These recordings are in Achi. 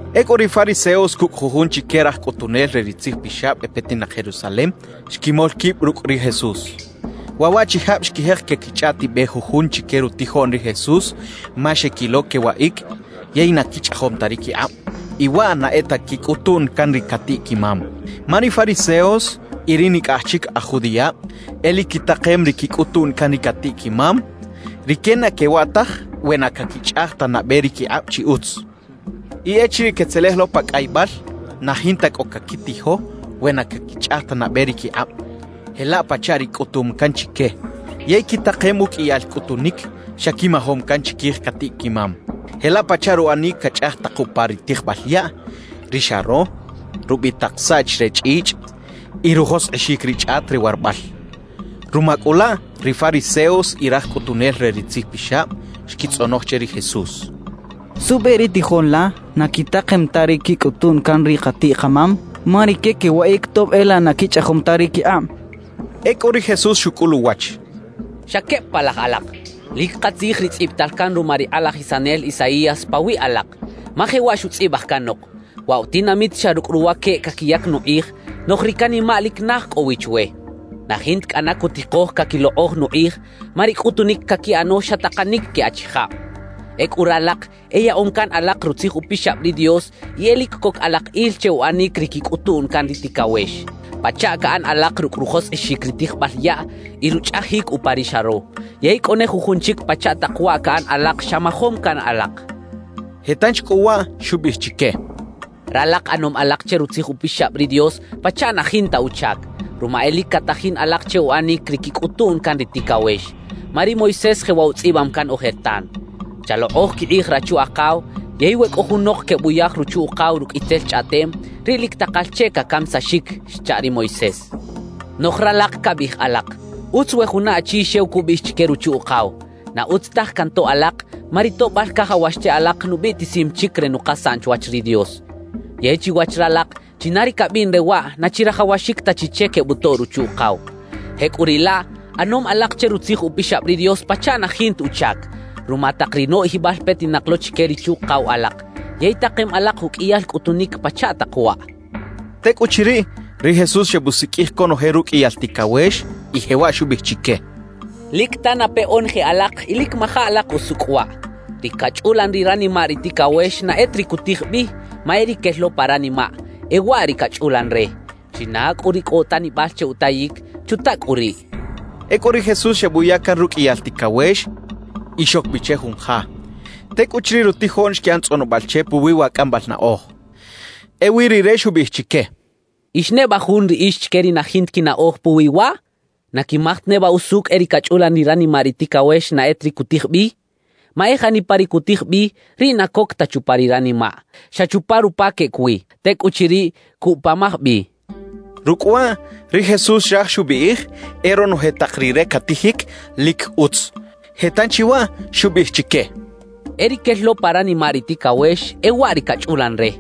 Ecꞌu ri fariseos cucꞌ jujun chique raj cꞌutunel re ri tzijpixab e petinak Jerusalem, xquimol quib rucꞌ ri Jesús. Waꞌ waꞌchijab xquijek quequichꞌaꞌtibej jujun chique rutijoꞌn ri Jesús ma xequilo quewaꞌic yey na quichꞌajom ta ri quikꞌab. Y waꞌ na e ta quicꞌutuꞌn can ri catiꞌ-quimam. Ma ri fariseos y ri nicꞌaj chic aj judiꞌab e lic quitakem ri quicꞌutuꞌn can ri catiꞌ-quimam. Rique na quewaꞌ taj we na caquichꞌaj ta nabe ri quikꞌab chi utz. Y echiriꞌ quetzelej lo pa cꞌaybal, na jinta cꞌo caquitijo we na caquichꞌaj ta nabe ri quikꞌab, jelaꞌ pachaꞌ ri cꞌutum can chique. Yey quitakem uqꞌuiyal cꞌutunic xa quimajom can chiquij catiꞌ-quimam, jelaꞌ pachaꞌ ruꞌanic cachꞌaj tak upa ri tijbal yaꞌ, ri xaro, rubitak saꞌch re chꞌichꞌ y rujoskꞌixic ri chꞌat re warabal. Ruma cꞌu laꞌ ri fariseos y raj cꞌutunel re ri tzijpixab xquitzꞌonoj che ri Jesús: —¿Suꞌbe ri tijoꞌn la na quitakem ta ri quicꞌutuꞌn can ri katiꞌ-kamam? Ma rique quewaꞌic tob e laꞌ na quichꞌajom ta ri quikꞌab —xechaꞌ. Ecꞌu ri Jesús xucꞌul uwach: —¡Xa queb palaj alak! Lic katzij ri tzꞌibital can ruma ri kꞌalajisanel Isaías pawiꞌ alak. Ma jewaꞌ xutzꞌibaj canok: Waꞌ wa tinamit xa rucꞌ ruwaqueꞌ caquiyac nukꞌij, noꞌj ri canimaꞌ lic naj cꞌo wi chwe. Na jinta cꞌana cutikoj caquilokꞌoj nukꞌij, ma ri cꞌutunic caquiꞌano xa takanic que achijab. Ecꞌu ralak e yaꞌom can alak Rutzij Upixab ri Dios y e lic coc alak il che uꞌanic ri quicꞌutuꞌn can ri ticawex, pachaꞌ caꞌan alak rucꞌ rujoskꞌixic ri tijbal yaꞌ y ruchꞌajic upa ri xaro; yey cꞌo ne jujun chic pachaꞌ tak waꞌ caꞌan alak xa majom can alak —xchaꞌ. Je tanchi cꞌu waꞌ xubiꞌij chique: —Ralak ꞌanom alak che Rutzij Upixab ri Dios pachaꞌ na jinta uchac, ruma e lic catajin alak che uꞌanic ri quicꞌutuꞌn can ri ticawex. Ma ri Moisés jewaꞌ utzꞌibam can ojertan: Chalokꞌoj quikꞌij rachu-akaw yey We cꞌo junok quebuyaj ruchu-ukaw rucꞌ itzel chꞌaꞌtem, riꞌ lic takal che cacamisaxic xcha ri Moisés. »Noꞌj ralak cabiꞌij alak: “Utz we juna achi xew cubiꞌij chique ruchu-ukaw: Na utz taj cantoꞌ alak, ma ri toꞌbal cajawax che alak, nubiꞌtisim chic re nukasaꞌn chwach ri Dios.” Yey chiwach ralak, china ri cabiꞌn re waꞌ, na chirajawaxic ta chi che quebutoꞌ ruchu-ukaw. Jecꞌuriꞌlaꞌ ꞌanom alak che Rutzij Upixab ri Dios pachaꞌ na jinta uchac, ruma tak ri noꞌjibal petinak lo chique ri chuꞌkaw alak. Yey takem alak uqꞌuiyal cꞌutunic pachaꞌ tak waꞌ —xchaꞌ. Tecꞌuchiriꞌ, ri Jesús xebusiqꞌuij conoje ruqꞌuiyal ticawex y jewaꞌ xubiꞌij chique: —Lic tanape onoje alak y lic maja alak usucꞌ waꞌ: Ri cachꞌulan ri ranimaꞌ ri ticawex na e ta ri cutij bi, ma e ri quel lo pa ranimaꞌ, e waꞌ ri cachꞌulan re. China cꞌu ri cꞌo utanibal che utayic, ¡chuta cꞌu riꞌ! —xcha chique. Ecꞌu ri Jesús xebuya can ruqꞌuiyal ticawex y xoc bi che jun ja. Tecꞌuchiriꞌ rutijoꞌn xquiꞌan tzꞌonobal che puwi wa cꞌambal naꞌoj. Ewi rire xubiꞌij chique: —¿Ix neba jun riꞌix chique ri na jinta quinaꞌoj puwi waꞌ? ¿Na quimaj ta neba usucꞌ e ri cachꞌulan ri ranimaꞌ ri ticawex na e ta ri cutij bi? Ma e janipa ri cutij bi, riꞌ na coc ta chupa ri ranimaꞌ; xa chupa rupa queꞌec wi. Tecꞌuchiriꞌ, cuꞌpamaj bi —xchaꞌ. Rucꞌ waꞌ ri Jesús xraj xubiꞌij e ronoje tak ri re catijic, lic utz. Je tanchi waꞌ xubiꞌij chique: —E ri quel lo pa ranimaꞌ ri ticawex, e waꞌ ri cachꞌulan re.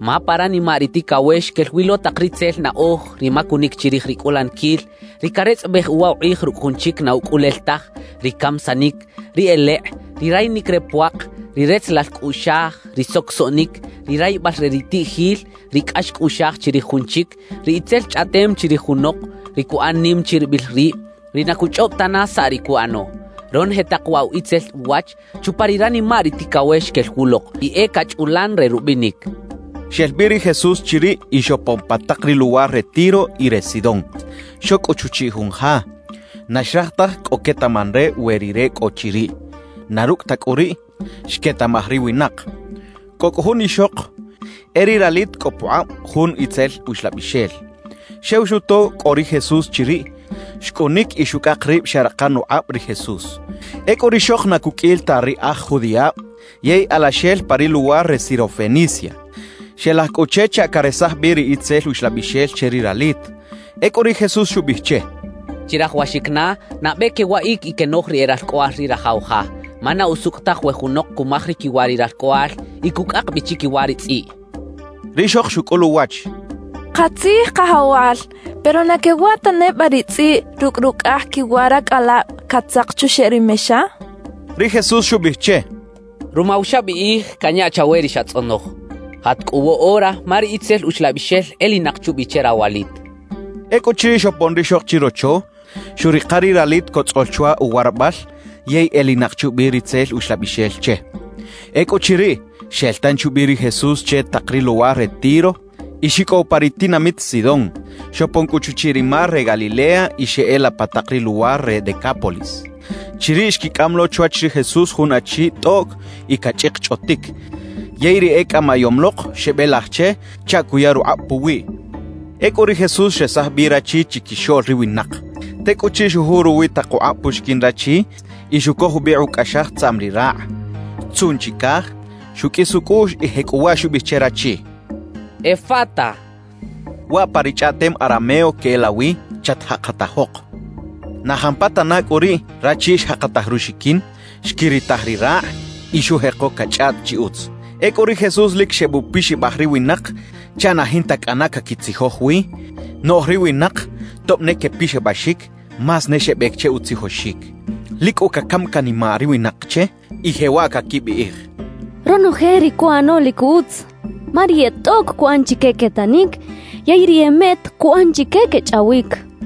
Ma pa ranimaꞌ ri ticawex quel wi lo tak ritzel naꞌoj, ri macunic chirij ri cꞌulaniquil, ri caretzꞌabej uwa ukꞌij rucꞌ jun chic na ucꞌulel taj, ri camisanic, ri elekꞌ, ri rayinic re puak, ri retzelal cꞌuꞌxaj, ri socosoꞌnic; ri rayibal re ri tiꞌjil, ri cꞌax cꞌuꞌxaj chirij jun chic, ri itzel chꞌaꞌtem chirij junok, ri cuꞌan nim chiribil rib, ri na cuchꞌob tana saꞌ ri cuꞌano. Ronoje tak waꞌ wa itzel uwach, chupa ri ranimaꞌ ri ticawex quel wulok y e cachꞌulan re rubinic —xchaꞌ. Xel bi ri Jesús chiriꞌ y xopon pa tak ri luwar re Tiro y re Sidón. Xoc cꞌu chuchiꞌ jun ja. Na xraj taj cꞌo quetaꞌman re we Rire cꞌo chiriꞌ; na rucꞌ ta cꞌu riꞌ, xquetaꞌmaj ri winak. Cꞌo cꞌu jun ixok, e ri ralit cꞌo pukꞌab jun itzel uxlabixel. Xew xuto cꞌo ri Jesús chiriꞌ, xcꞌunic y xucꞌak rib xeꞌrakan ukꞌab ri Jesús. Ecꞌu rixok na cuqꞌuil ta ri aj judiꞌab yey alaxel pa ri luwar re Sirofenicia. Xelaj cꞌu che chaꞌ caresaj bi ri itzel uxlabixel che ri ralit. Ecꞌu ri Jesús xubiꞌij che: —Chirajawaxic na nabe quewaꞌic y quenoj ri e ralcꞌoꞌal ri rajaw ja, ma na usucꞌ taj we junok cumaj ri quiwa ri ralcꞌoꞌal y cucꞌak bi chiquiwa ri tzꞌiꞌ —xcha che. Rixok xucꞌul uwach: —Katzij, Kajawal, pero ¿na quewaꞌ ta neba ri tzꞌiꞌ rucꞌ rucꞌaj quiwa racꞌalab catzak chuxeꞌ ri mexa? —xchaꞌ. Ri Jesús xubiꞌij che: —Ruma wa xabiꞌij, canya chawe ri xatzꞌonoj. Jat cꞌu woꞌora ma ri itzel uxlabixel elinak chubi che rawalit —xchaꞌ. Ecꞌuchiriꞌ xopon rixok chirocho, xuꞌrika ri ralit cotzꞌol chwa uwarabal yey elinak chubi ri itzel uxlabixel che. Ecꞌuchiriꞌ, xel tanchi ubi ri Jesús che tak ri luwar re Tiro y xicꞌow pa ri tinamit Sidón. Xopon cꞌu chuchiꞌ ri mar re Galilea y xeꞌela pa tak ri luwar re Decápolis. Chiriꞌ xquicꞌam lo chwach ri Jesús jun achi tꞌoꞌc y cachꞌikchꞌotic, yey ri ecꞌamayom lok xebelaj che chaꞌ cuya rukꞌab puwiꞌ. Ecꞌu ri Jesús xresaj bi rachi chiquixoꞌl ri winak. Tecꞌuchiriꞌ xujuꞌ ruwi tak ukꞌab puxiquin rachi y xucoj jubikꞌ ucꞌaxaj tzaꞌm ri rakꞌ. Xtzuꞌn chicaj, xuqꞌuis ucꞌuꞌx y jecꞌuwaꞌ xubiꞌij che rachi: «¡Efata!» (Waꞌ pa ri chꞌaꞌtem arameo queꞌelawi “chatjakatajok”.) Na jampatana cꞌu riꞌ, rachi xjakataj ruxiquin, xquiritaj ri rakꞌ y xujeko cachꞌaꞌt chi utz. Ecꞌu ri Jesús lic xebupixabaj ri winak chaꞌ na jinta cꞌana cꞌo caquitzijoj wi, noꞌj ri winak tob ne quepixabaxic, más ne xebec che utzijoxic. Lic cꞌu cacam canimaꞌ ri winak che y jewaꞌ caquibiꞌij: «Ronoje ri cuꞌano lic utz, ma ri e tꞌoꞌc cuꞌan chique quetanic yey ri e meꞌt cuꞌan chique quechꞌawic.»